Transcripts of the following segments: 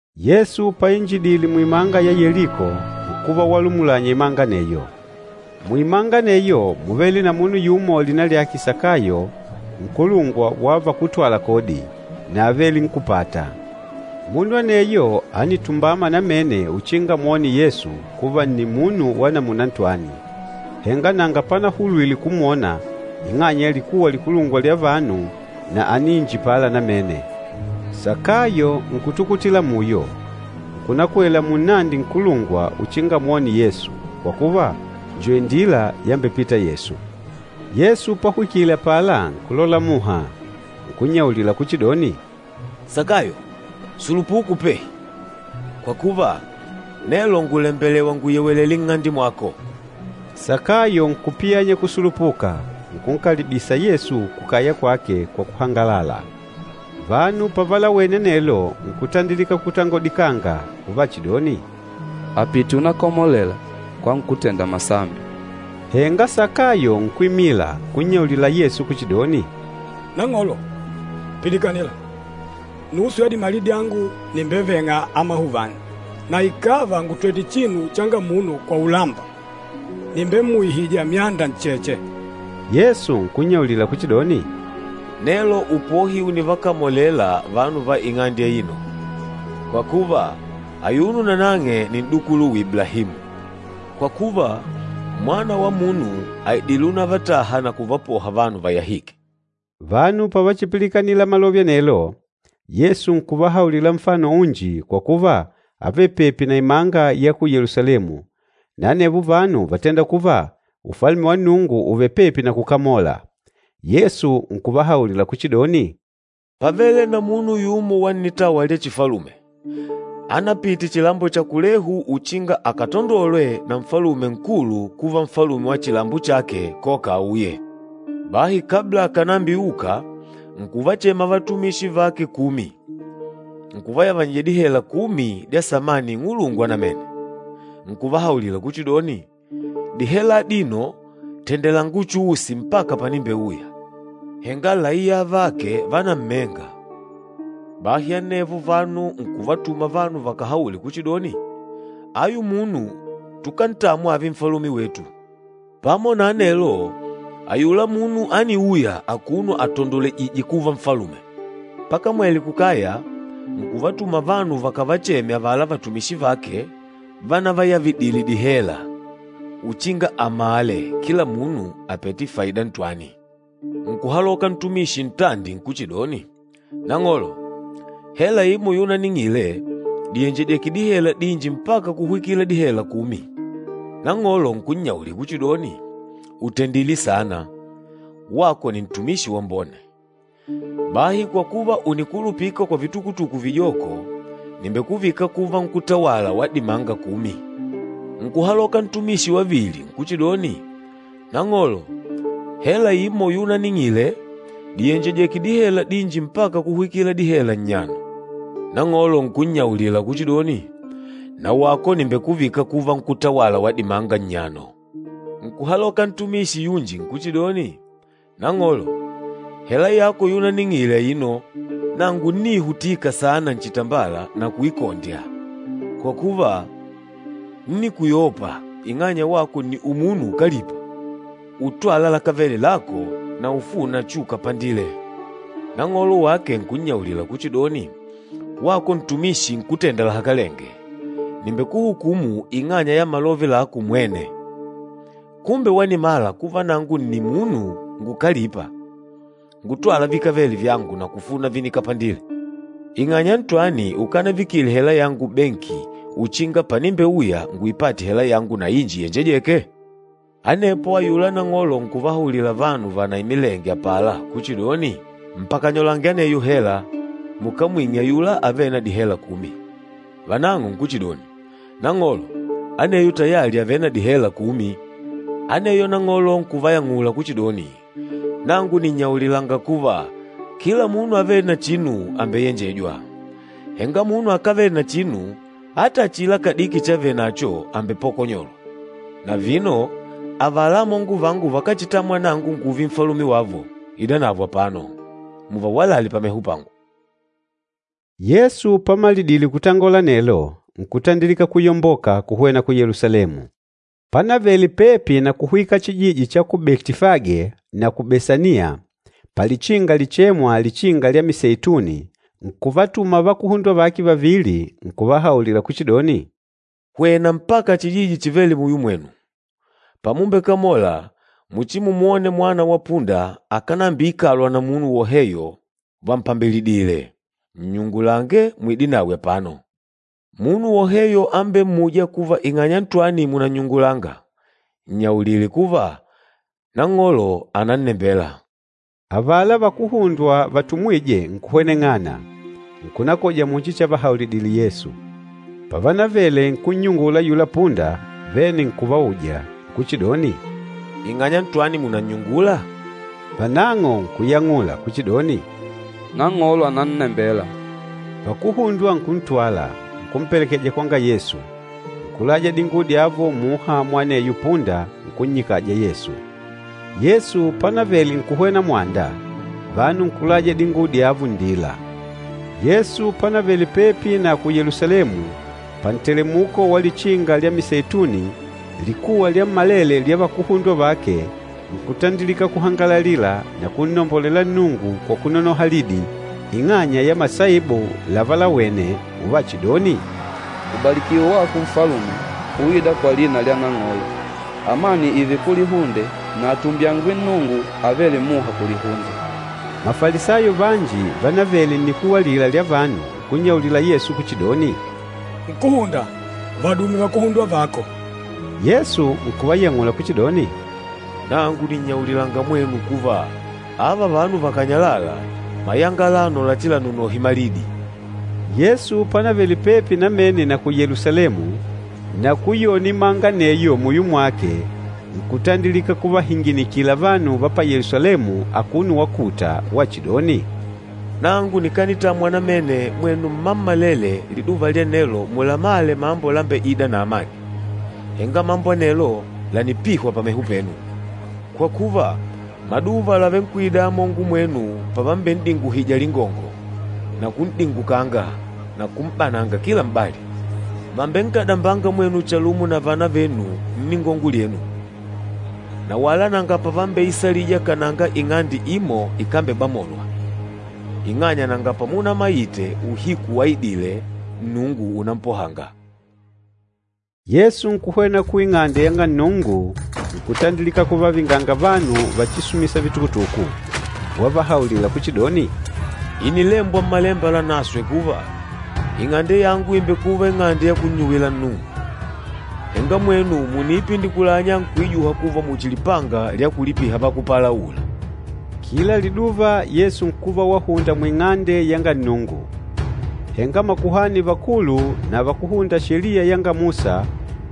Yesu painjidile muimanga ya Yeliko, nkuva walumulanya imanga aneyo. Muimanga aneyo múvele na munu yumo lina lyake Sakayo, nkulungwa wa vakútwala kodi, na ávele nkúpata. Munu aneyo ánitumbama namene uchinga amwone Yesu kuva nni munu wa namuna ntwani, henga nanga panahulwile kumwona ing'anya ya likuwa likulungwa lya vanu na ániinjipala namene. Sakayo nkutukutila muyo, nkunakwela munnandi nkulungwa uchinga amwone Yesu, kwa kuva, njo indila yambepita Yesu. Yesu pahwikile apala nkulola muha, nkunnyaulila kuchidoni, “Sakayo, sulupuka upehi, kwa kuva, nelo ngùlembelewa nguyewelele nng'ande mwako.” Sakayo nkupiyanya kusulupuka, nkunkalibisa Yesu kukaya kwake kwa kuhangalala. Vanu pavalawene anelo, nkutandilika kutangodikanga uvachidoni, “Àpite unakamolela kwa nkútenda masambi.” Henga Sakayo nkwimila nkunnyaulila Yesu kuchidoni, “Nang'olo, pilikanila! Nusu ya dimali dyangu nìmbeveng'a amahuvani, na ikàva ngùtwete chinu changa munu kwa ulamba, nìmbemmuihija myanda ncheche.” Yesu nkunnyaulila kuchidoni, “Nelo upohi ùnivakamolela vanu va ing'ande aino, kwa kuva, ayuno nanang'e nni n'dukuluwe Iblahimu. Kwa kuva, Mwana wa Munu àidile unavataha na kuvapoha vanu vayahîke.” Vanu pavachipilikanila malove anelo, Yesu nkuvahaulila nfano unji kwa kuva ávele pepi na imanga ya ku Yelusalemu, na anevo vanu vátenda kuva Ufalume wa Nnungu ùvele pepi na kukamola. Yesu nkuvahaulila kuchidoni, “Pávele na munu yumo wa nnitawa lya chifalume ánapite chilambo cha kulehu uchinga akatandolwe na nfalume nkulu kuva nfalume wa chilambo chake, koka auye. Bahi kabla akànambiuka, nkuvachema vatumishi vake kumi, nkuvayavanyija dihela kumi dya samani ing'ulungwa namene, nkuvahaulila kuchidoni, ‘Dihela adino tendelanga uchuusi mpaka panimbeuya.’ Henga laiya avake vánammenga. Bahi anevo vanu nkuvatuma vanu vakahaule kuchidoni, ‘Ayu munu tukántamwa ààve nfalume wetu.’ Pamo na anelo, ayula munu ániuya akuno atandolwejìjè kuva nfalume. Pakamwele kukaya, nkuvatuma vanu vakavacheme avala vatumishi vake vanavayavidile dihela uchinga amale kila munu àpete faida ntwani. Nkuhaloka ntumishi ntandi nkuchidoni, ‘Nang'olo, hela imo yunaning'ile dìyenjejeke dihela dinji mpaka kuhwikila dihela kumi.’ Nang'olo nkunnyaulila kuchidoni, ‘Ùtendile sana, wako nni ntumishi wambone. Bahi kwa kuva ùnikulupika kwa vitukutuku vijoko, nìmbekuvika kuva nkútawala wa dimanga kumi!’ Nkuhaloka ntumishi wavili nkuchidoni, ‘Nang'olo, hela imo yunaning'ile dìyenjejeke dihela dinji mpaka kuhwikila dihela nnyano.’ Nang'olo nkunnyaulila kuchidoni, ‘Na wako nìmbekuvika kuva nkútawala wa dimanga nnyano.’ Nkuhaloka ntumishi yunji nkuchidoni, ‘Nang'olo, hela yako yunaning'ile aino. Nangu ńniihutika saana nchitambala na kuikondya, kwa kuva, ńnikuyopa ing'anya wako nni umunu ukalîpa, utwâla lakávele lako na ufûna chukapandile.’ Nang'olo wake nkunnyaulila kuchidoni, ‘Wako ntumishi nkútenda lahakalenge, nìmbekuhukumu ing'anya ya malove lako umwene! Kumbe wanimala kuva nangu nni munu ngukalîpa, ngutwâla vikávele vyangu na kufuna vinikapandile. Ing'anya ntwani ukanaivikile hela yangu benki uchinga panimbeuya nguipate hela yangu na inji iyenjejêke?’ Anepo ayula nang'olo nkuvahaulila vanu vanaimilenge apala kuchidoni, ‘Mpakanyolange aneyo hela, mukamwing'e ayula avêle na dihela kumi.’ Vanang'o nkuchidoni, ‘Nang'olo, aneyo tayali àvele na dihela kumi!’ Aneyo nang'olo nkuvayang'ula kuchidoni, ‘Nangu nìnnyaulilanga kuva, kila munu avêle na chinu àmbeyenjejwa. Henga munu akávele na chinu ata achila kadiki chavenacho àmbepokonyolwa. Na vino avala amongo vangu vakáchitamwa nangu ngùùve nfalume wavo, idanavo apano, muvawalale pameho pangu.’” Yesu pamalidile kutangola anelo, nkutandilika kuyomboka kuhwena ku Yelusalemu. Panavele pepi na kuhwika chijiji cha ku Betifage na ku Besaniya, palichinga lichêmwa Lichinga lya Miseituni, nkuvatuma vakuhundwa vake vavili, nkuvahaulila kuchidoni, “Hwena mpaka chijiji chivêle muyo mwenu. Pamumbekamola, muchimumwone mwana wa punda akánambiikalwa na munu woheyo vampambilidìlè. Nnyungulange muide nawe apano. Munu woheyo ambemmûja kuva ing'anya ntwani mùnannyungula, nnyaulile kuva, ‘Nang'olo ànannembela.’” Avala vakuhundwa vatumwîje nkuhweneng'ana, nkunakoja muchi chavahaulidile Yesu. Pavanavele nkunnyungula ayula punda, vene nkuvauja nkuchidoni, “Ing'anya ntwani mùnannyungula?” Vanang'o nkuyang'ula kuchidoni, “Nang'olo ànannembela.” Vakuhundwa nkuntwala, nkumpelekeja kwanga Yesu, nkulaja dinguwo dyavo muha mwa aneyo punda nkunnyikaja Yesu. Yesu panavele nkuhwena mwanda, vanu nkulaja dinguwo dyavo nndila. Yesu panavele pepi na ku Yelusalemu, pantelemuko wa Lichinga lya Miseituni, likuwa lyammalele lya vakuhundwa vake nkutandilika kuhangalalila na kunnombolela Nnungu kwa kunonoha lidi, ing'anya ya masaibu lavalawene, uvachidoni, “Ubalikiwe wako Nfalume, uîda kwa lina lya Nang'olo. Amani ììve kulihunde na atumbyangwe Nnungu avêle muha kulihunde!” Mafalisayo vanji vanavele nnikuwa alila lya vanu nkunnyaulila Yesu kuchidoni, “Nkúhunda, vadume vakuhundwa vako!” Yesu nkuvayang'ula kuchidoni, “Nangu nìnnyaulilanga mwenu kuva, ‘Ava vanu vakànyalala, mayanga alano lachilanonohe malidi.’” Yesu panavele pepi namene na ku Yelusalemu, na kuyona imanga muyo aneyo mwake nkutandilika kuvahinginikila vanu va pa Yelusalemu akuno wakuta, wachidoni, “Nangu nikanitamwa namene mwenu mmammalele liduva lya nelo mulamale mambo lambeîda na amani! Henga mambo anelo lànipihwa pameho penu. Kwa kuva, maduva làvenkwida amongo mwenu pavamben'dinguhija lingongo, na kun'dingukanga na kum'bananga kila m'bali. Vambenkadambanga mwenu chalumo na vana venu nningongo lyenu, na wala nanga pavambeisalija kananga ing'ande imo ikambebamolwa, ing'anya nanga pamunamaite uhiku wanaidile Nnungu unampohanga.” Yesu nkuhwena ku Ing'ande yanga Nnungu, nkutandilika kuvavinganga vanu vachisumisa vitukutuku, wavahaulila kuchidoni, “Ìnilembwa Mmalemba Lanaswe kuva, ‘Ing'ande yangu ìmbekuva ing'ande ya kunnyuwila Nnungu.’ Henga mwenu mùniipindikulanya nkuijuha kuva muchi lipanga lya kulipiha vakúpalaula.” Kila liduva Yesu nkuva wahunda mu Ing'ande yanga Nnungu. Henga makuhani vakulu na vakúhunda Sheliya yanga Musa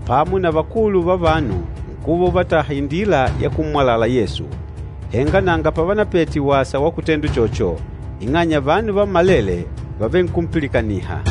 pamo na vakulu va vanu nkuva uvataha indila ya kummwalala Yesu, henga nanga pavanapete wasa wa kutenda uchocho, ing'anya vanu vammalele vávenkumpilikaniha.